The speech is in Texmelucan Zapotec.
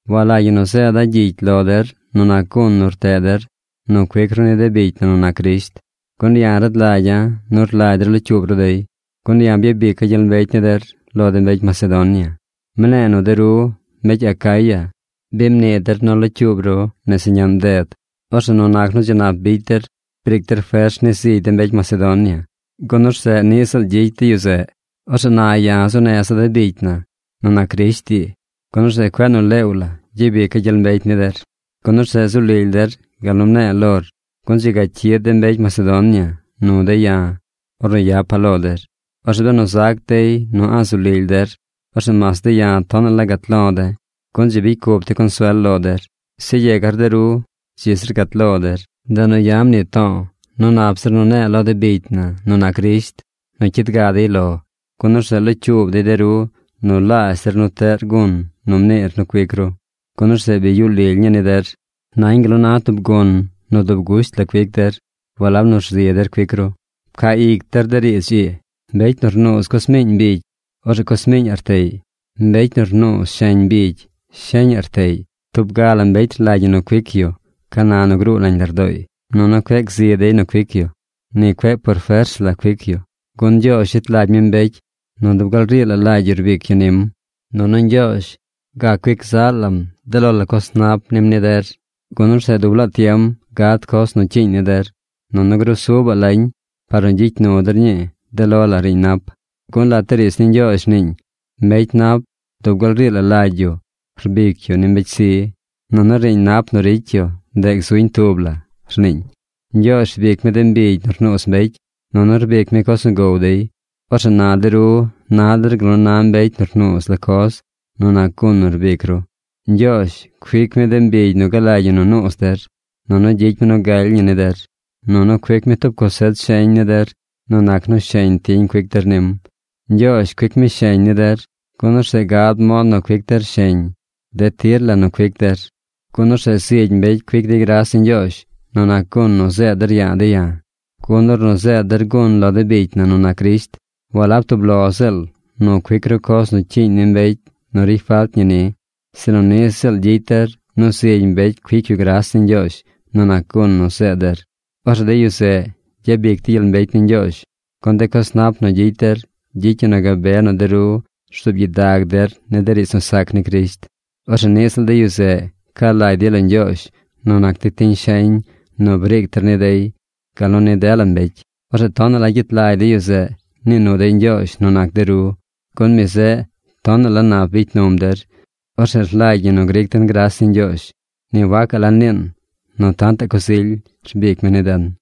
Walagy ñi nu zeeda̱ gyicy lo der nu nac gun nu rteꞌ der nu cuic ru ni de bicy na nu nac Crisht, gun ya̱ rad lagya̱ nu rlagy der locyuub ru dey. Gun ya̱ byabica̱ gyel mbecy ni der lo de mbecy Macedonia. Mne̱e̱ nu de ru, mbecy Acaya, bi mnii der nu locyuub ru nese ñaꞌn bded. Orzeꞌ nu nac nu dzi nap bicy der, briic der fers ni zigy de mbecy Macedonia, gun orzeꞌ niꞌ ziꞌl gyicy dey yu zeꞌ. Orzeꞌ na ya̱ zuu neza̱ de bicy na nu nac Crisht ii, gun orzeꞌ cueꞌ nu leew la gyabica̱ gyel mbecy ni der. Gun orzeꞌ zu lily der gal nu mne̱e̱ lor. Gun dzi ga cyid de mbecy Macedonia nu de̱ ya̱ ornu yapa̱ lo der. Orzeꞌ benu zac dey nu a̱ꞌ zu lily der, orzeꞌ mas de̱ ya̱ tonaꞌ la gat lo̱ de̱, gun dzi bicy cup de̱ consuel lo der. Zeꞌ yegar de ru dzi zir gat lo der. Ndeꞌ nu ya̱ mnii to̱o̱ nu nap zir nu ne̱e̱ lo de bicy na nu nac Crisht nu cyid ga dey lo, gun orzeꞌ locyuub dey de ru nu laazh der nu teꞌr gun nu mniir nu cuic ru. Gun orzeꞌ bi yuꞌ lily ñii ni der. Nañ gal nu na tub gun nu dub gusht la cuic der, walab nu rzi der cuic ru. Pcaa ic der de riidz ii: Mbecy nu rnuuz coz miiñ mbigy, orzeꞌ coz miiñaꞌ rteꞌy. Mbecy nu rnuuz sheñ mbigy, sheñaꞌ rteꞌy. Tub ga la mbecy rlagy ñi nu cuic yu ca na nu gruu nañ lardooy. Nunu cueꞌ gzi dey nu cuic yu. Ni cueꞌ por fers la cuic yu. Gun Ñgyoozh yet lagy mi mbecy nu dub gal rii la lagy yu rbic yu nim. Nunu Ñgyoozh gac cuic zaꞌ lam de lo la coz nap nim ni der, gun orzeꞌ dub laa tiem gad coz nu cyiiñ ni der, nunu grusubaꞌ lañ par nu gyicy nu der ñii de lo la riiñ nap. Gun lat de riidz ni Ñgyoozh rniiñ: Mbecy nap dub gal rii la lagy yu rbic yu ni mbecy zi. Nunu riiñ nap nu ricy yu, ndeꞌ gzuñ tub la, rniiñ. Ñgyoozh rbic mi de mbigy nu rnuuz mbecy. Nunu rbic mi coz nu gow dey. Orzeꞌ na de ru na der gal nu na mbecy nu rnuuz la coz nu nac gun nu rbic ru. Ñgyoozh cuic mi de mbigy nu galagy ñi nu nuuz der. Nunu gyicy mi nu galy ñi ni der. Nunu cuic mi tub cosech sheñ ni der nu nac nu sheñ tiñ cuic der nim. Ñgyoozh cuic mi sheñ ni der, gun orzeꞌ gad mod nu cuic der sheñ de tir la nu cuic der. Gun orzeꞌ zigy mbecy cuic dey gras ni Ñgyoozh nu nac gun nu zeed der ya̱a̱ de̱ ya̱. Gun ornu zeed der gun lo de bicy na nu nac Crisht, walab tub lo ziꞌl nu cuic ru coz nu cyiiñ ni mbecy nu ricy falt ñi ni, sinu niꞌ ziꞌl gyicy der nu zigy mbecy cuic yu gras ni Ñgyoozh nu nac gun nu zeed der. Orzeꞌ de yu zeꞌ gyabic dey gyel mbecy ni Ñgyoozh, gun de coz nap nu gyicy der gyicy ñi nu gabe nu de ru rzuub gyidag der ni de riidz nu sac ni Crisht. Orzeꞌ niꞌ ziꞌl de yu zeꞌ ca lagy dey lo Ñgyoozh nu nac de tiñ sheñ nu briic der ni dey gal nu ni dela mbecy. Orzeꞌ tonaꞌ la gyet lagy de yu zeꞌ nii nu dey Ñgyoozh nu nac de ru, gun mi zeꞌ tonaꞌ la nap bicy num der. ¡Orzeꞌ rlagy ñi nu gric den gras ni Ñgyoozh! ¡Ni wacaꞌ la niin nu tantaꞌ coz ily rbic mi ni den!